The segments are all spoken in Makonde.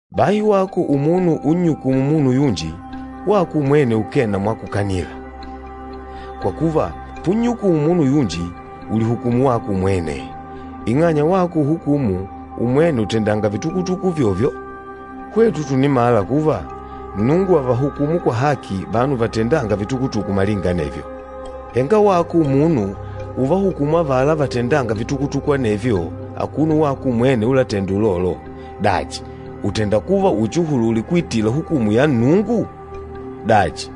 Bahi wako umunu unnyukûmu munu yunji, wako umwene ukee na mwakukanila. Kwa kuva, punnyukumu munu yunji, ùlihukumu wako umwene, ing'anya wako uhukûmu, umwene ùtendanga vitukutuku uvyovyo. Hwetu tùnimala kuva, Nnungu àvahukumu kwa haki vanu vatendânga vitukutuku malinga anevyo. Henga wako umunu uvahukûmu avala vatendânga vitukutuku anevyo, akuno wako umwene úlatèndà ulolo! Dachi, ùtenda kuva uchiuhulule kuitila hukumu ya Nnungu? Dachi,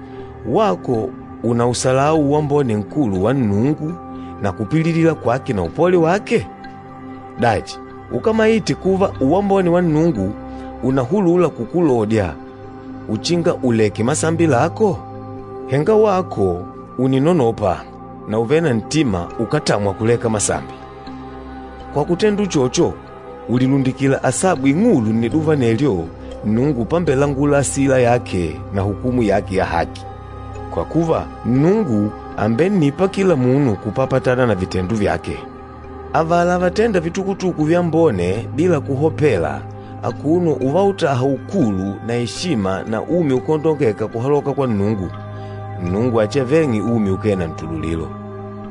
wako ùnausalau uwambone nkulu wa Nnungu na kupililila kwake na upole wake? Dachi, ukámaite kuva uwambone wa Nnungu ùnahulula kukulodya uchinga uleke masambi lako? Henga wako ùninonopa na ùvele na ntima ukátamwa kuleka masambi. Kwa kutenda uchocho, ùlilundikila asabu ing'ulu nniduva anelyo Nnungu pambelangula asila yake na hukumu yake ya haki. Kwa kuva, Nnungu àmbennipa kila munu kupapatana na vitendo vyake. Avala vatênda vitukutuku vyambone bila kuhopela akuno uvautaha ukulu na eshima na umi ukáondongeka kuhaloka kwa Nnungu, Nnungu achiaveng'e umi ukee na ntululilo.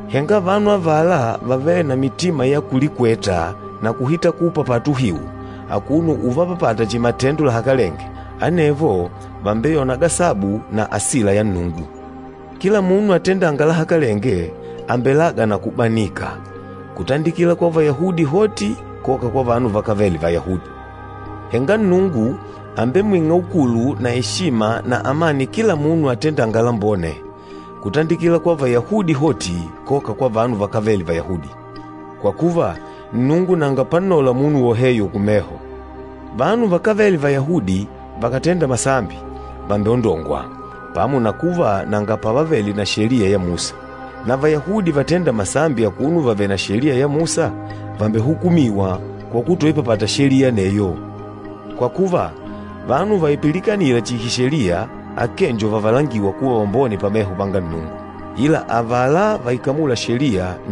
Henga vanu avala vavêle na mitima ya kulikweta na kuhita kuupapata uhiu, akuno uvapapata chihi matendo lahakalenge, anevo vàmbeyona gasabu na asila ya Nnungu. Kila munu atendânga lahakalenge àmbelaga na kubanika, kutandikila kwa Vayahudi hoti koka kwa vanu vakávele Vayahudi. Henga Nnungu àmbemwing'a ukulu na eshima na amani kila munu atendânga lambone, kutandikila kwa Vayahudi hoti koka kwa vanu vakávele Vayahudi. Kwa kuva, Nnungu nanga pannola munu woheyo kumeho. Vanu vakávele Vayahudi vakàtenda masambi, vàmbeondongwa, pamo na kuva nanga pavavele na Sheliya ya Musa. Na Vayahudi vatênda masambi akuno vavèlè na Sheliya ya Musa, vàmbehukumiwa kwa kutoipapata Sheliya aneyo. Kwa kuva, vanu vaipilikanîla chihi Sheliya akee njo vatêndwa kuva vambone pameho panga Nnungu, ila nni avala vaikamûla Sheliya.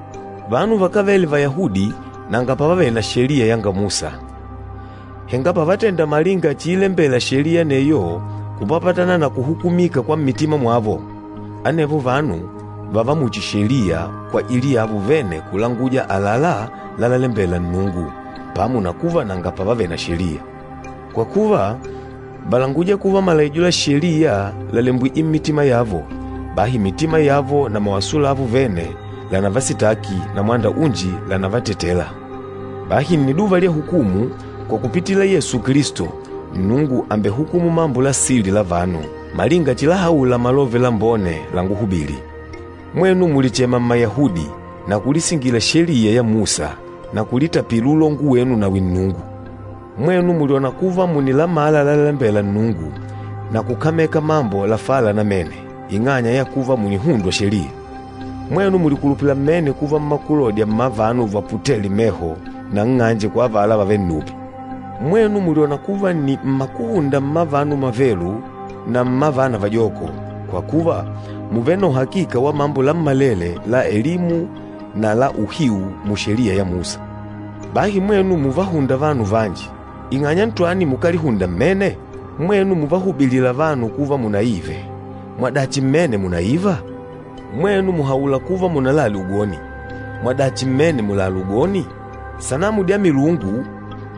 Vanu vakávele Vayahudi nanga pavavele na Sheliya yanga Musa. Henga pavatenda malinga chiilembela Sheliya aneyo kupapatana na kuhukumika kwa mmitima mwavo, anevo vanu vààva muchi Sheliya kwajili yavo vene kulanguja àlalá lalalembela Nnungu, pamo na kuva nanga pavavele na Sheliya. Kwa kuva, vàlanguja kuva malaijo la Sheliya làlembwije mmitima yavo, bahi mitima yavo na mawaso lavo vene lànavasitaki na mwanda unji lànavatetela. Bahi nniduva lya hukumu, kwa kupitila Yesu Kilisto, Nnungu àmbehukumu mambo la sili la vanu, malinga chilahaula Malove Lambone lánguhubìlì. Mwenu mùlichema Mmayahudi na kulisingila Sheliya ya Musa na kulitapila uloongo wenu nawi Nnungu. Mwenu mùlyona kuva mùnilamala lalalembela Nnungu na kukameka mambo lafala namene, ing'anya ya kuva mùnihundwa Sheliya. Mwenu mùlikulupila mmene kuva mmakulodya mma vanu vaputêle meho na nng'anje kwa avala vavêle nnupi. Mwenu mùlyona kuva nni mmakuhunda mma vanu mavelu na mma vana vajoko, kwa kuva, mùvele na uhakika wa mambo lammalele la elimu na la uhiu mu Sheliya ya Musa. Bahi mwenu muvahûnda vanu vanji, ing'anya ntwani mukálihunda mmene? Mwenu muvahubilîla vanu kuva munaive, mwadachi mmene mùnaiva? Mwenu mùhaula kuva munalale ugoni, mwadachi mmene mùlala ugoni?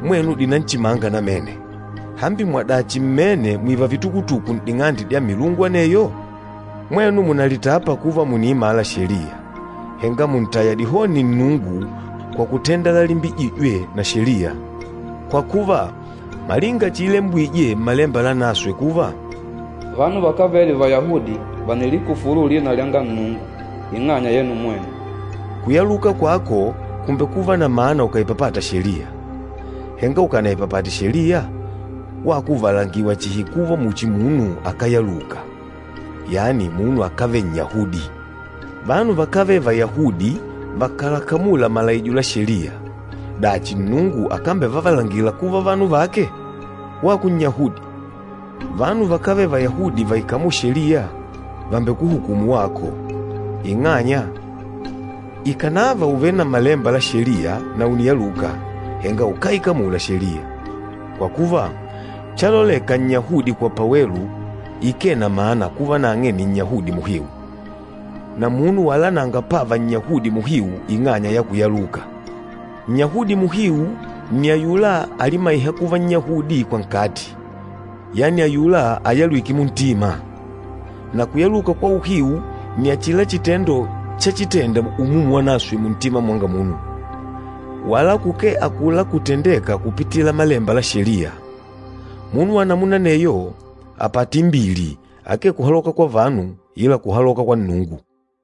Mwenu mùnadichima namene disanamu dya milungu, hambi mwadachi mmene mwìva vitukutuku n'ding'ande dya milungu aneyo? Mwenu mùnalitapa kuva mùniimala Sheliya, henga mùntaya dihoni Nnungu kwa kutenda lalimbijîjwe na Sheliya! Kwa kuva, malinga chiilembwije Mmalemba Lanaswe kuva, “Vanu vakávele Vayahudi vànilikufulu lina lyanga Nnungu ing'anya yenu mwenu.” Kuyaluka kwako kùmbekuva na mana ukàipapata Sheliya. Henga ukànaipapate Sheliya, wako ùvalangiwa chihi kuva muchi munu akáyaluka, yani munu akávele Nnyahudi. Vanu vakávele Vayahudi vakàlakamula malaijo la Sheliya, dachi Nnungu akambevavalangila kuva vanu vake? Wako Nnyahudi, vanu vakávele Vayahudi vaikamûla Sheliya vàmbekuhukumu wako, ing'anya, ikànava ùvele na malemba la Sheliya na ùniyaluka, henga ukáikamula Sheliya. Kwa kuva, chaloleka Nnyahudi kwa pawelu ikee na mana kuva nang'e ni Nnyahudi muhiu, na munu wala nanga pava Nnyahudi muhiu ing'anya ya kuyaluka. Nnyahudi muhiu nni ayula alimaîha kuva Nnyahudi kwa nkati, yani ayula ayalwîke muntima. Na kuyaluka kwa uhiu nni achila chitendo chachitenda Umumu Wanaswe muntima mwanga munu, wala kukee akula kutendêka kupitila malemba la Sheliya. Munu wa namuna aneyo àpata imbili, akee kuhaloka kwa vanu, ila kuhaloka kwa Nnungu.